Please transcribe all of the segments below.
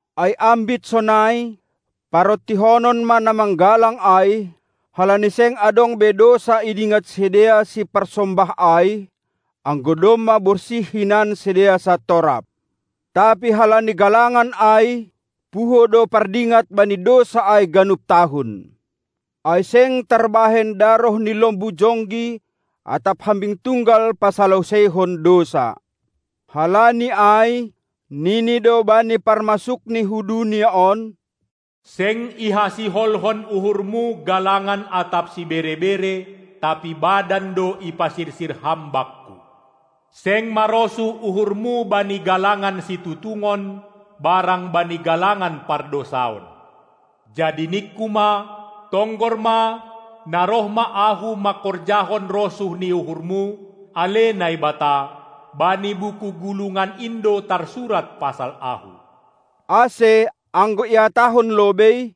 Ai ambit sonai, parontihonon ma na manggalang ai, halani seng adong be dousa idingat sidea siparsombah ai, anggo domma borsih hinan sidea santorap. Tapi halani galangan ai, puho do pardingat bani dousa ai ganup tahun. Ai seng tarbahen daroh ni lombu jonggi atap hambing tunggal pasaloseihon dousa. Halani ai, nini do bani parmasukni hu dunia on: "Seng ihasiholhon uhurMu galangan atap sibere-bere, tapi badan do ipasirsir Ham bakku. Seng marosuh uhurMu bani galangan situtungon barang bani galangan pardousaon. Jadi ningKu ma: Tonggor ma, na roh ma Ahu mangkorjahon rosuh ni uhurMu, ale Naibata; bani buku gulungan in do tarsurat pasal Ahu." Ase, anggo ihatahon lobei: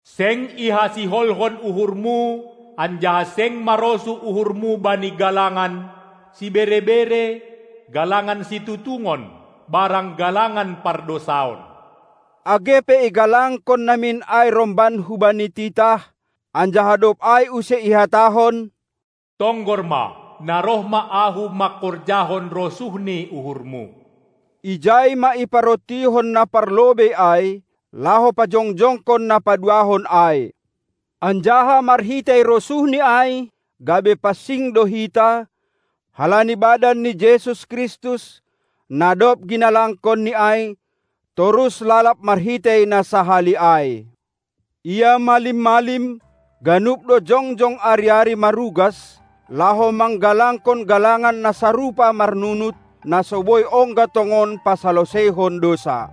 "Seng ihasiholhon uhurmu anjaha seng marosuh uhurmu bani galangan, sibere-bere, galangan situtungon barang galangan pardousaon", age pe igalangkon namin ai romban hubani titah, anjaha dob ai use ihatahon: "Tonggor ma, na roh ma Ahu mangkorjahon rosuh ni uhurmu!", ijai ma iparontihon na parlobei ai, laho pajongjongkon na paduahon ai. Anjaha marhitei rosuhni ai gabe pansing do hita, halani badan ni Jesus Kristus, na dob ginalangkonni ai, torus lalab marhitei na sahali ai. Ia malim-malim, ganup do jongjong ari-ari marugas, laho manggalangkon galangan na sarupa marnunut, na so boi ongga tongon pasaloseihon dousa.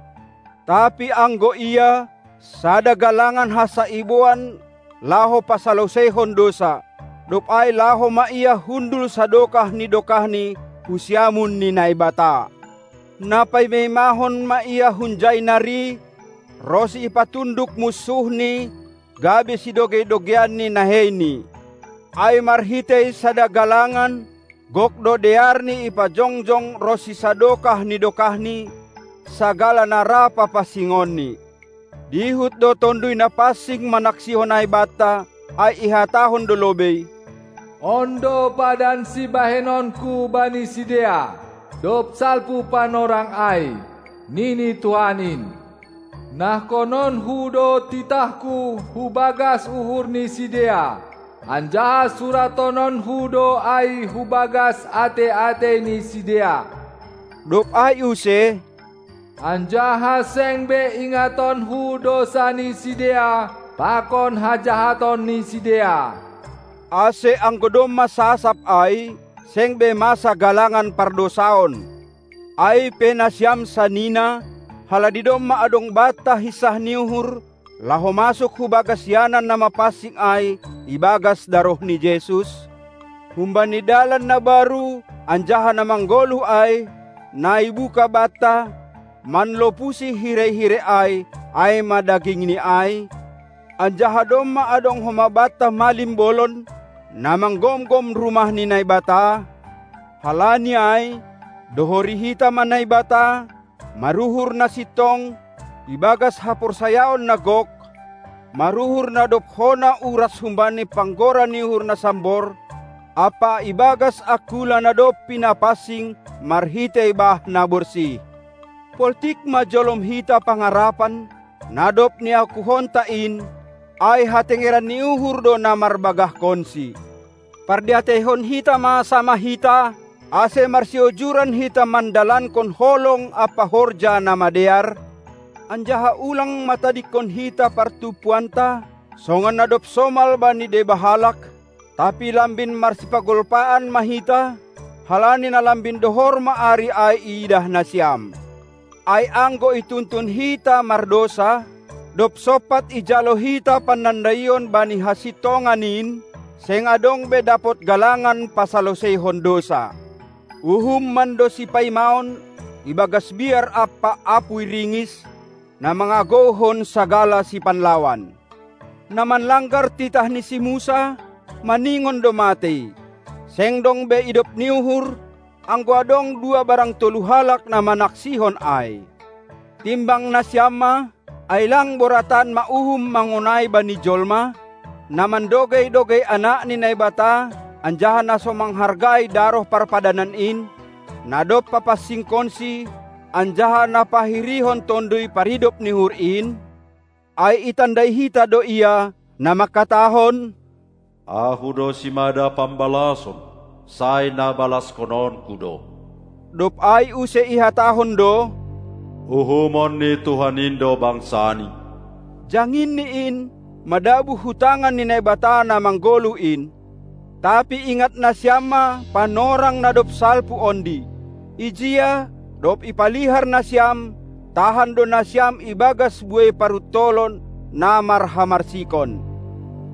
Tapi anggo Ia, sada galangan hansa iboan laho pasaloseihon dousa; dob ai laho ma Ia hundul sadokah ni dokahni hu siamun ni Naibata. Na paima-imahon ma Ia hunjai nari, ronsi ipatunduk munsuhNi gabe sidogei-dogeian ni naheiNi. Ai marhitei sada galangan, gok do dearNi ipajongjong ronsi sadokah ni dokahni, sagala na ra papansingonNi. Dihut do Tonduy Napansing manaksihon ai banta, ai ihatahon do lobei: "On do padan sibahenonku bani sidea, dob salpu panorang ai", nini Tuhan in: "NahkononKu do titahKu hubagas uhur ni sidea, anjaha surathononKu do ai hubagas atei-atei ni sidea." Dob ai use: "Anjaha seng be ingatonKu dousa ni sidea pakon hajahaton ni sidea." Ase anggo domma sasap ai, seng be masa galangan pardousaon. Ai pe nasiam sanina, halani domma adong banta hinsah ni uhur laho masuk hubagas ianan na mapansing ai ibagas daroh ni Jesus, humbani dalan na baru anjaha na manggoluh ai, na ibuka banta, manlopusi hirei-hirei ai, ai ma dagingNi ai, anjaha domma adong homa banta malim bolon, na manggomgom Rumah ni Naibata, halani ai, dohori hita ma Naibata, maruhur na sintong, ibagas haporsayaon na gok, maruhur na dob hona uras humbani panggora ni uhur na sambor ampa ibagas angkula na dob pinapansing marhitei bah na borsih. Poltik ma jolom hita pangarapan, na dob niakuhonta in, ai hatengeran ni uhur do na marbagahkonsi. Pardiateihon hita ma samah hita, ase marsiojuran hita mandalankon holong ampa horja na madear, anjaha ulang ma tadingkon hita partumpuanta, songon na dob somal bani deba halak, tapi lambin marsipagolpaan ma hita, halani na lambin dohor ma ari ai iidah nasiam. Ai anggo ituntun hita mardousa, dob sompat ijalo hita panandaion bani hasintongan in, seng adong be dapot galangan pasaloseihon dousa. Uhum mando sipaimaon ibagas biar ampa apuy ringis, na mangagouhon sagala sipanlawan. Na manlanggar titah ni si Musa, maningon do matei, seng dong be idop ni uhur, anggo adong dua barang tolu halak na manaksihon ai. Timbang nasiam ma, ai lang boratan ma uhum mangonai bani jolma, na mandogei-dogei Anak ni Naibata anjaha na so manghargai daroh parpadanan in, na dob papansingkonsi, anjaha na pahirihon Tonduy Paridop ni uhur in? Ai itanda hita do Ia, na mangkatahon: Ahu do simada pambalason, sai na balashononKu do! Dob ai use ihatahon do: Uhumon ni Tuhan in do bangsaNi. Jangin ni in, madabuh hu tangan ni Naibata na manggoluh in! Tapi ingat nasiam ma panorang na dob salpu ondi. Ijia, dob ipalihar nasiam, tahan do nasiam ibagas buei paruntolon na marhamarsikon.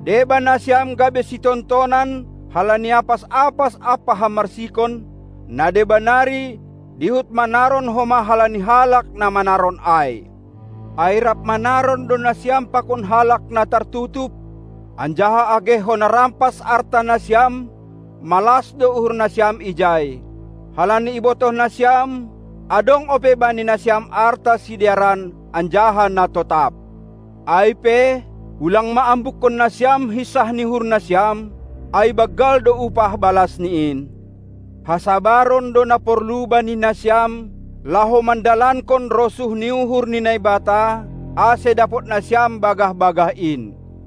Deba nasiam gabe sitontonan halani apas-apas ampa hamarsikon, na deba nari dihut manaron homa halani halak na manaron ai. Ai rap manaron do nasiam pakon halak na tartutup, anjaha age hona rampas arta nasiam, malas do uhur nasiam ijai, halani ibotoh nasiam, adong ope bani nasiam arta sidearan anjaha na totap. Ai pe, ulang ma ambukkon nasiam hinsah ni uhur nasiam, ai banggal do upah balas ni in! Hasabaron do na porlu bani nasiam, laho mandalankon rosuh ni uhur ni Naibata, ase dapot nasiam bagah-bagah in.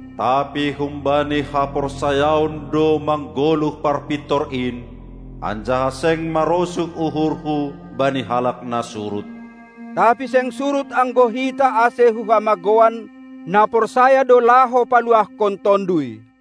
Tapi hum Bani haporsayaon do manggoluh parpintor in, anjaha seng marosuh uhurhu bani halak na surut. Tapi seng surut anggo hita ase hu hamagouan; na porsaya do laho paluahkon tonduy.